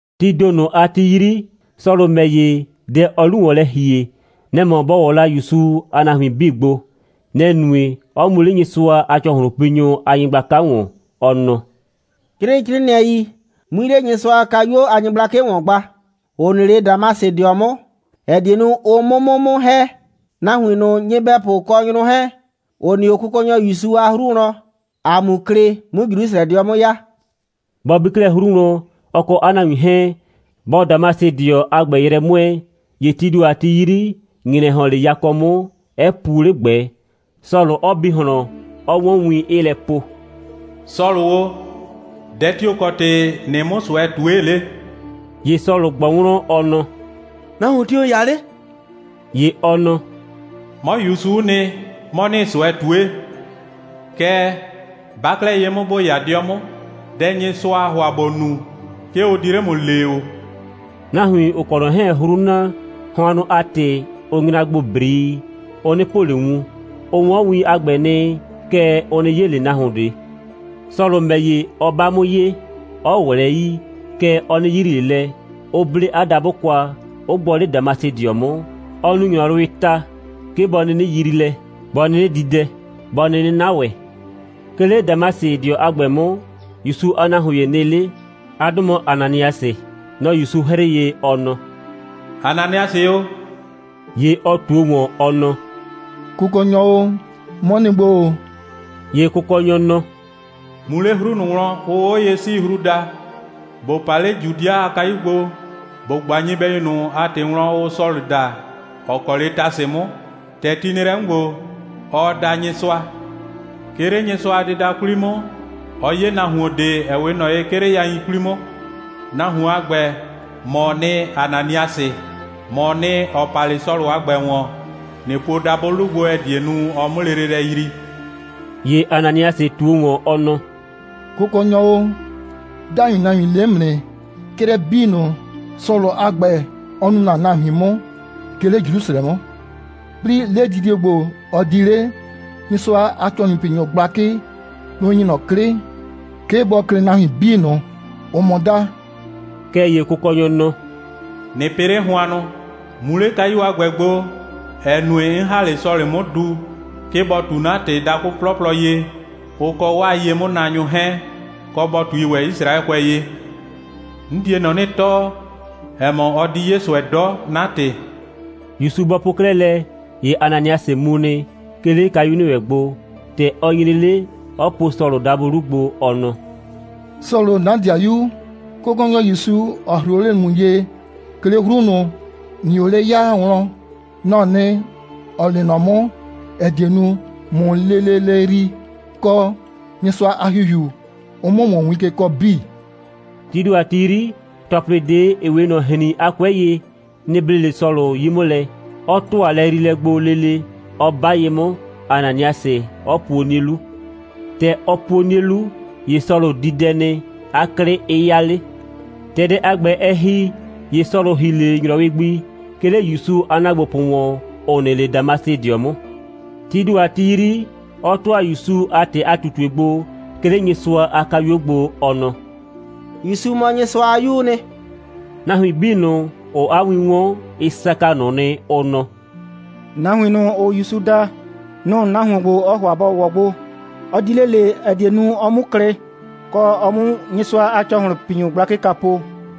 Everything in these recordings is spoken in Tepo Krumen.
Tii ‑do ꞊nʋ a ti 'yri, Sɔlʋ ‑mɛ ‑ye, dɛ, ɔɔ la 'lu ‑wɔn lɛ ‑hie, nɛ‑ mɔ bɔ ‑wɔ la ‑Yusu a nahuin 'bii gbo. Nɛ‑ nue, 'ɔ mu 'le Nyɩsʋa a ‑cɔhlʋnpinyʋ a nyɩgblaka ‑wɔn, ɔ nɔ: «'Crɩɩ 'crɩɩnɩɛi, 'mui 'le Nyɩsʋa a kayuo a nyɩgblakɩ ‑wɔn gba, ‑ʋ nɩ 'le Damasɩdɩɔ 'mʋ, ‑ɛ die nu, ʋ 'mʋ 'mʋ 'mʋ ‑hɛ, nahuin ꞊nʋ, nyɩbɛpʋ kɔ nyrʋ 'hɛɛn, ‑ʋ nɩ 'o Kʋkɔnyɔ ‑Yusu a 'hru wlɔn, ‑a 'mu klɩ, 'mu Jrusrɛdɩɔ 'mʋ ya.» Bɔ bi 'klɛɛ 'hru wlɔn, ɔ kɔ 'a nahuin 'hɛɛn, bɔɔ Damasɩdɩɔ a ‑gbɛ yrɛ 'mʋɛɛ, ‑ye tii ‑do a ti 'yri, ‑nyrɛ ‑hɔn 'le yakɔ 'mʋ, 'ɛ puo 'le ꞊gbɛ, Sɔlʋ 'ɔ bi ꞊hlɔn, 'ɔ 'wɔn win, 'ɩɩ lɛ po: «Sɔlʋ o, dɛ tio‑ kɔ ‑tɩ ‑nɩɩ 'mʋ ꞊sʋɛ ꞊tue 'le?» ‑Ye Sɔlʋ ꞊gbɔ wlɔn, ɔ nɔ: «Nahuon tio‑ ‑n 'ya 'le?» ‑Ye ɔ nɔ: «'Mɔ ‑Yusu'u nɩ, 'mɔ ‑nɩɩ ꞊sʋɛ ꞊tue. Kɛɛ, 'ba 'klɛɛ ye 'mʋ, ‑bo 'ya 'dɩɔ 'mʋ. Dɛ, Nyɩsʋaa ‑hʋa ‑bo nu, 'ke ʋ di 'le ‑mʋ lee ‑o.» Nahuin, ‑ʋ kɔ ꞊nɔ 'hɛɛn 'hru na, hʋannʋ a ‑tɩ, ʋ nyra gbo ‑brii, ʋ 'nɩ po ꞊le wun. Ʋ 'wɔn win a ‑gbɛ nɩ, kɛɛ, ʋ 'nɩ 'ye ꞊le nahuon ꞊de. Sɔlʋ ‑mɛ ‑ye, ɔ 'ba 'mʋ ye, 'ɔ ꞊wlɛɛ 'yii, kɛɛ, ɔ 'nɩ yrii ꞊le lɛ, 'ʋ 'ble 'a dabʋ kwa, 'ʋ gbɔ 'le Damasɩdɩɔ 'mʋ, 'ɔ nu ‑nyrɔwɩɩ ta, 'ke bɔ 'nɩnɩ yrii lɛ, bɔ 'nɩnɩ di dɛ, bɔ 'nɩnɩ 'na ‑wɛ. 'Ke 'le Damasɩdɩɔ a ‑gbɛ 'mʋ, ‑Yusu a nahuon ‑ye nɩ 'le. 'A 'dʋ mɔ Ananiasɩ. Nɔ‑ ‑Yusu 'hrɩɩ ye, ɔ nɔ: «Ananiasɩ o!» ‑Ye ɔ ꞊tuo ‑wɔn, ɔ nɔ: «Kʋkɔnyɔ o, 'mɔ nɩ gbo ‑o.» ‑Ye Kʋkɔnyɔ nɔ: «Mu 'le 'hru ꞊nʋ wlɔn, ʋʋ 'Oye'siihru daa, ‑bo pa 'le Judɩa a kayu gbo, ‑bo ꞊gba nyɩbɛyu ꞊nʋ a ‑tɩ wlɔn, ʋʋ Sɔlʋ daa, ‑ɔ kɔ 'le Tasɩ 'mʋ. ‑Tɛ ti nɩ lɛ 'mʋ ‑gbo, ɔɔ da Nyɩsʋa. 'Ke 'le Nyɩsʋa a dɩda 'kwli 'mʋ, ɔ 'ye nahuon ꞊de, ‑ɛ 'we ꞊nɔ ye 'ke 'le yain 'kwli 'mʋ. Nahuon a ‑gbɛ, ‑mɔɔ nɩ, Ananiasɩ. ‑Mɔɔ nɩ, ‑ɔ pa 'le Sɔlʋ a ‑gbɛ ‑wɔn, ꞊nɩ puo dabʋɩ 'lu gbo, ‑ɛ die nu, ɔ 'mʋ lele lɛ yrii.» ‑Ye Ananiasɩ ꞊tuo ‑wɔn, ɔ nɔ: «Kʋkɔnyɔ o, 'dai nahuin le 'mʋ nɩ, 'crɛ 'bii ꞊nʋ, Sɔlʋ a ‑gbɛ, ɔ nu ‑na nahuin 'mʋ, 'ke 'le Jrusrɛ 'mʋ. 'Plɩɩ, 'ledidie ‑gbo, ɔ di 'le, Nyɩsʋa a ‑cɔhlʋnpinyʋ gblakɩ, nʋ‑ ‑nyi ꞊nɔ 'klɩ, 'ke bɔ klɩ nahuin 'bii ꞊nʋ, ‑ʋʋ ‑mʋ da.» Kɛɛ ‑ye Kʋkɔnyɔ nɔ: «꞊Nɩ pɩ 'le hʋannʋ, mu 'le kayu a ‑gbɛ gbo, ‑ɛ nue, 'n ‑ha 'le Sɔlʋ a ‑gbɛ 'mʋ du, 'ke bɔ ꞊tu 'na ‑tɩ dakʋ 'plɔplɔ ye, ʋ kɔ 'waa ye'mʋnaanyʋ 'hɛɛn, kɔ, bɔ ꞊tui ‑wɛ Yisraɛkʋɛ ye. 'N die ꞊nɔ 'nɩ tɔɔ, ‑ɛ mɔ, ɔ di 'ye ꞊sʋɛ 'dɔ 'na ‑tɩ.» ‑Yusu bɔ po 'klɛɛ lɛ, ‑ye Ananiasɩ mu nɩ, 'ke 'le kayu ‑nɩ wɛn gbo. ‑Tɛ ɔ nyre 'le, 'ɔ po Sɔlʋ dabʋ 'lu gbo, ɔ nɔ: «Sɔlʋ, 'na 'dɩayu, Kʋkɔnyɔ ‑Yusu, ‑ɔ 'hrɩɩ o 'le ‑mʋ ye, 'ke 'le 'hru ꞊nʋ, ‑nɩɩ o 'le ya wlɔn, nɔ‑ɔ nɩ, ‑ɔ lee nɔ 'mʋ, ‑ɛ die nu, ꞊mʋ lele lɛ yrii, kɔ, Nyɩsʋa a ‑Hihiu, ʋ 'mʋ ‑mʋ win ke kɔɔ 'bii.» Tii ‑do a ti 'yri, ‑tɔplɩ ꞊de, ‑ɩ 'we ꞊nɔ ‑hrin a 'kʋɛ ye, nɩ‑ ble 'le Sɔlʋ 'yi 'mʋ lɛ, 'ɔ ‑tʋa lɛyriilɛ gbo lele, 'ɔ 'ba ye 'mʋ, Ananiasɩ 'ɔ puo 'nie 'lu. ‑Tɛ ɔ puo 'nie 'lu, ‑ye Sɔlʋ di dɛ nɩ, 'a 'klɩ 'ɩ 'ya 'le. ‑Tɛ dɛ a ‑gbɛ, ɛ ‑hi, ‑ye Sɔlʋ ‑hi 'le ‑nyrɔwɩ gbi, 'ke 'le ‑Yusu a ‑naagbopʋ ‑wɔn, ‑ʋ nɩ 'le Damasɩdɩɔ 'mʋ. Tii ‑do a ti 'yri, 'ɔ ‑tʋa ‑Yusu a ‑tɩ a ꞊tutue gbo, 'ke 'le Nyɩsʋa a kayuo gbo, ɔ nɔ: «‑Yusu mɔ Nyɩsʋa a 'Yuu nɩ.» Nahuin 'bii ꞊nʋ, ‑ʋʋ 'a win 'wɔn, ɩ saka ꞊nʋ nɩ, ʋ nɔ: «Nahuin ꞊nʋ, ‑ʋʋ ‑Yusu da, nʋ‑ nahuon ‑gbo, ɔɔ ‑hʋa bɔ ‑wɔ o gbo. Ɔ di 'le ꞊le, ‑ɛ die nu, ɔ 'mu klɩ, kɔ, ɔ 'mu Nyɩsʋa a ‑cɔhlʋnpinyʋ gblakɩ kwa po.»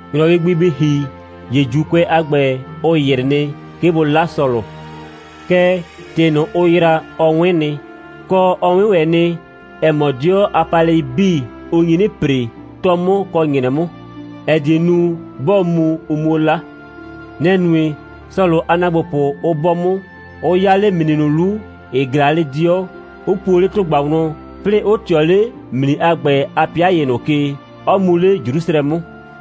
‑Nyrɔwɩ gbi bɩ ‑hi, ‑ye ‑Juukʋɛ a ‑gbɛ, ʋ ‑yrɩ nɩ, 'ke bʋ 'la Sɔlʋ. Kɛɛ, ‑tɩ ꞊nʋ, ʋ ‑yra, ɔ 'wɩn nɩ, kɔ, ɔ 'wɩn ‑wɛ nɩ, ‑ɛ mɔ, 'dɩɔ a paalɛi 'bii, ʋ nyi 'nɩ ‑pre, 'tɔ 'mʋ kɔ ‑nyrɛ 'mʋ, ‑ɛ die nu, 'bɔɔ mu, ʋ 'muo 'la. Nɛ‑ nue, Sɔlʋ a ‑naagbopʋ 'ʋ 'bɔ 'mʋ, 'ʋ 'ya 'le ‑mli ꞊nʋ 'lu, ‑ɩ ꞊glaa 'le 'dɩɔ, 'ʋ puo 'le ‑tʋgba wlɔn, 'plɩɩ 'ʋ ꞊tɩɔ 'le ‑mli a ‑gbɛ a 'pɩa ‑ye ꞊nʋ ke, 'ɔ mu 'le Jrusrɛ 'mʋ.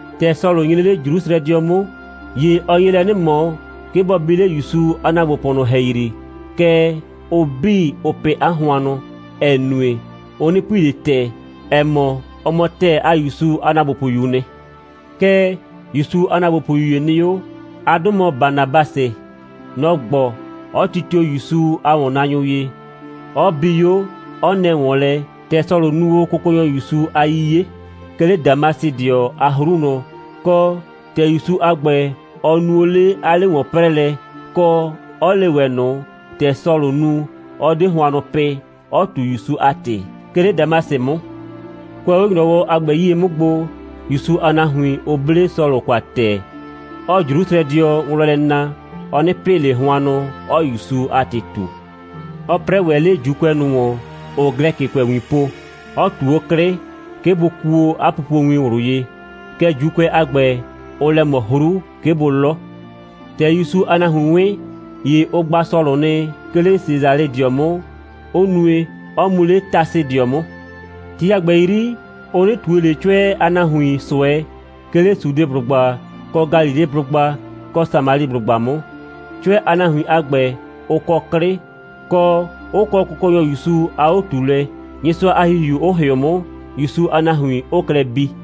‑Tɛ Sɔlʋ nyre 'le Jrusrɛdɩɔ 'mʋ, ‑ye ɔ nye lɛ 'nɩ ꞊mɔ, 'ke bɔ bi 'le ‑Yusu a ‑naagbopʋ ꞊nʋ ‑hɛyri, kɛɛ, ʋ 'bii, ʋʋ pɩ 'a hʋannʋ, ‑ɛ nue, ʋ 'nɩ pui ꞊le ‑tɛɛ, ‑ɛ mɔ, ɔ mɔ ‑tɛɛ a ‑Yusu a ‑naagbopʋyuu nɩ. Kɛɛ, ‑Yusu a ‑naagbopʋyu ‑ye nɩ 'o. 'A 'dʋ mɔ Banabasɩ. Nɔ‑ gbɔ, 'ɔ titio ‑Yusu a ‑wɔnnaanyʋ ye, 'ɔ bi 'o, 'ɔ nɛ ‑wɔn lɛ, ‑tɛ Sɔlʋ nu o Kʋkɔnyɔ ‑Yusu a 'yiye, 'ke 'le Damasɩdɩɔ a 'hru wlɔn, kɔ, ‑tɛ ‑Yusu a ‑gbɛ, ɔ nu o 'le 'a 'le‑wɔn'prɛɛlɛ, kɔ, 'ɔ le ‑wɛ ꞊nʋ, ‑tɛ Sɔlʋ nu, 'ɔ 'de hʋannʋ pɩ, 'ɔ ꞊tu ‑Yusu a ‑tɩ, 'ke 'le Damasɩ 'mʋ. Kʋɛ 'o ‑nyrɔwɔ a ‑gbɛ 'yie 'mʋ gbo, ‑Yusu a nahuin, ʋ 'ble Sɔlʋ kwa ‑tɛɛ, 'ɔɔ Jrusrɛdɩɔ wlɔn lɛ na, ɔ 'nɩ pɩ ꞊le hʋannʋ, 'ɔɔ ‑Yusu a ‑tɩ ꞊tu. Ɔ 'prɛɛ ‑wɛ 'le ‑Juukʋɛ ꞊nʋ ‑wɔn, ‑ʋʋ Glɛkɩkʋɛwin po, 'ɔ ꞊tu 'o 'klɩ, 'ke bʋ kuo 'a pupowin ꞊wlʋ ye. Kɛɛ, ‑Juukʋɛ a ‑gbɛ, ʋʋ lɛ ꞊mɔ 'hru, 'ke bʋ 'lɔ. ‑Tɛ ‑Yusu a nahuin 'wɩn, ‑ye ʋ gba Sɔlʋ nɩ, 'ke 'le Sesalɩdɩɔ 'mʋ, 'ʋ nue, 'ɔ mu 'le Tasɩdɩɔ 'mʋ. Ti a ‑gbɛ 'yri, ʋ 'nɩ ꞊tue ꞊le 'cʋɛ a nahuin ꞊sʋɛ, 'ke 'le Sudeblʋgba kɔ Galileblʋgba kɔ Samaliblʋgba 'mʋ. 'Cʋɛ a nahuin a ‑gbɛ, ʋ kɔ 'klɩ, kɔ, 'ʋ kɔ Kʋkɔnyɔ ‑Yusu a 'o꞊tuulɛ, Nyɩsʋa a ‑Hihiu 'ʋ ‑hɩʋ 'mʋ, ‑Yusu a nahuin 'ʋʋ klɛ bii.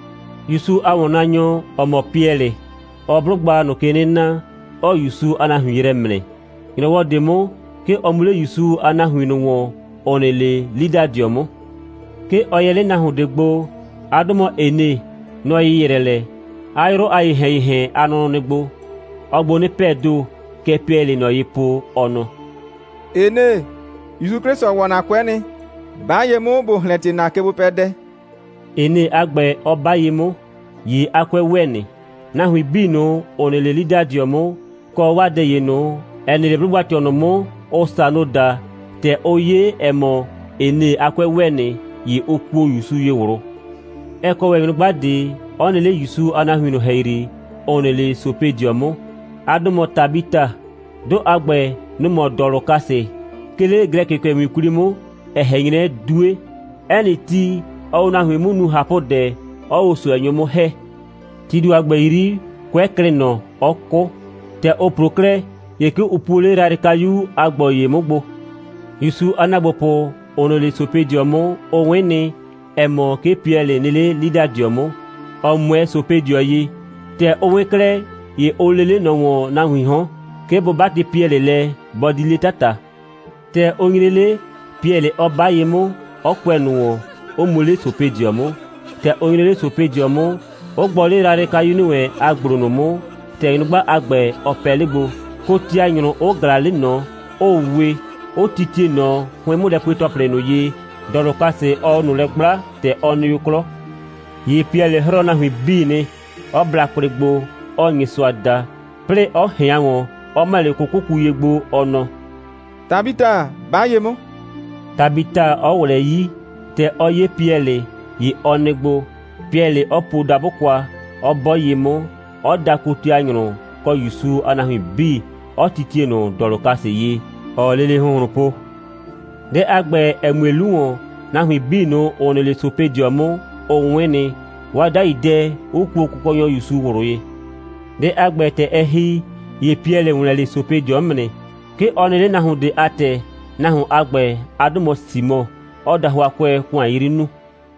‑Yusu a ‑wɔnnaanyɔ, ‑ɔ mɔ Piɛlɩ, ɔɔ 'blʋgba ꞊nʋ ke 'nɩ na, 'ɔɔ ‑Yusu a nahuin yrɛ ‑mrɛ. ‑Nyrɔwɔ ꞊de 'mʋ, 'ke ɔ mu 'le ‑Yusu a nahuin ꞊nʋ ‑wɔn, ‑ʋ nɩ 'le Lidadɩɔ 'mʋ. 'Ke ɔ yɛ 'le nahuon ꞊de gbo. 'A 'dʋ mɔ Ene. Nɔ‑ ‑yɩyrɛ lɛ, 'a 'yrʋ a ‑yehɛn‑yehɛn a nʋnʋ nɩ gbo. Ɔɔ gbo 'nɩ pɛɛ ‑do. Kɛ Piɛlɩɩ ꞊nɔ ye po, ɔ nɔ: «Ene, ‑Yusu 'Klɩsʋ ‑wɔ ‑na 'kʋɛ nɩ. 'Ba ye 'mʋ, ‑bo ‑hlɛntie ‑na kegbopɛdɛ,» Ene a ‑gbɛ 'ɔ 'ba ye 'mʋ. ‑Ye 'a 'kʋɛ ‑wɛ nɩ. Nahuin 'bii ꞊nʋ, ‑ʋ nɩ 'le Lidadɩɔ 'mʋ, kɔ 'waa dɛ ꞊nʋ, ‑ɛ nɩ 'le 'blʋgba꞊tɩɔ ꞊nʋ 'mʋ, ʋʋ Sano daa, ‑tɛ ʋ 'ye, ‑ɛ mɔ, Ene a 'kʋɛ ‑wɛ nɩ, ‑ye ʋ kuo ‑Yusu ye ꞊wlʋ. Ɛ kɔ ‑wɛ nyrʋgba ꞊de, 'ɔ nɩ 'le ‑Yusu a nahuin ꞊nʋ ‑hɛyri, ‑ʋ nɩ 'le Sopedɩɔ 'mʋ. 'A 'dʋ mɔ Tabita. 'Dʋ a ‑gbɛ, nʋ‑ mɔ Dɔlʋkasɩ, 'ke 'le Glɛkɩkʋɛwin 'kwli 'mʋ, ‑ɛ ꞊hɛn 'nyrɛ 'Due. 'Ɛ nɩ ti, ɔɔ o nahuin 'mʋ nu ꞊hapʋdɛ, 'ɔɔ o ꞊sʋɛnyʋ 'mʋ ‑hɛ. Tii ‑do a ‑gbɛ 'yri, 'kʋɛ klɩ ꞊nɔ, 'ɔ 'kʋ. ‑Tɛ ʋ ‑plo 'klɛɛ, ‑ye 'ke ʋ puo 'le yrayrɩkayu a ‑gblo ‑ye 'mʋ gbo. ‑Yusu a ‑naagbopʋ, ‑ʋ nɩ 'le Sopedɩɔ 'mʋ, ʋ 'wɩn nɩ, ‑ɛ mɔ, 'ke Piɛlɩ nɩ 'le Lidadɩɔ 'mʋ, ‑ɔ 'mʋɛɛ Sopedɩɔ ye. ‑Tɛ ʋ 'wɩn 'klɛɛ, ‑ye ʋ lee 'le ꞊nɔ ‑wɔn nahuiin 'hɔn, 'ke bʋ 'batɩ Piɛlɩ lɛ, bɔ di 'le 'tata. ‑Tɛ ʋ nyre 'le, Piɛlɩ 'ɔ 'ba ye 'mʋ, 'ɔ kʋɛ ꞊nʋ ‑wɔn, 'ʋ mu 'le Sopedɩɔ 'mʋ. ‑Tɛ ɔ nyre 'le Sopedɩɔ 'mʋ, 'ʋ gbɔ 'le yrayrɩkayu ‑nɩ wɛn a ‑gblo ꞊nʋ 'mʋ, ‑tɛ nyrʋgba a ‑gbɛ, ɔ pɛ 'le gbo, kotianyrʋ 'ʋ ꞊glaa 'le ꞊nɔ, 'ʋʋ we, 'ʋ titie ꞊nɔ 'hʋɩn'mʋlɛpue‑tɔplɩ ꞊nʋ ye, Dɔlʋkasɩ, ɔɔ o ꞊nʋ lɛ 'gblaa, ‑tɛ ɔ nɩ o 'klɔ. ‑Ye Piɛlɩ 'hrɔɔ nahuin 'bii nɩ, 'ɔ bla kwlɩ gbo, 'ɔɔ Nyɩsʋa da, 'plɩɩ 'ɔ ꞊hɩan ‑wɔn, 'ɔ ‑mɛ 'le 'kʋkʋku ye gbo, ɔ nɔ: «Tabita, 'ba ye 'mʋ!» Tabita 'ɔ ꞊wlɛɛ 'yii. ‑Tɛ ɔ 'ye Piɛlɩ, ‑ye ɔ nɩ gbo, Piɛlɩ 'ɔ puo dabʋ kwa, 'ɔ 'bɔ ye 'mʋ, 'ɔ da kotianyrʋ kɔ ‑Yusu a nahuin 'bii, 'ɔ titie ꞊nʋ Dɔlʋkasɩ ye, ‑ɔɔ lele ‑hʋnhlʋn po. Dɛ a ‑gbɛ, ‑ɛ mue 'lu ‑wɔn, nahuin 'bii ꞊nʋ, ‑ʋ nɩ 'le Sopedɩɔ 'mʋ, ʋ 'wɩn nɩ, 'waa 'dai dɛ 'ʋ kuo Kʋkɔnyɔ ‑Yusu ꞊wlʋ ye. Dɛ a ‑gbɛ, ‑tɛ ɛ ‑hi, ‑ye Piɛlɩ ‑wlɛn 'le Sopedɩɔ 'mʋ nɩ. 'Ke ɔ nɩ 'le nahuon ꞊de a ‑tɛ. Nahuon a ‑gbɛ, 'a 'dʋ mɔ Simɔ, 'ɔɔ dahʋakʋɛ ‑kʋan 'yri nuu.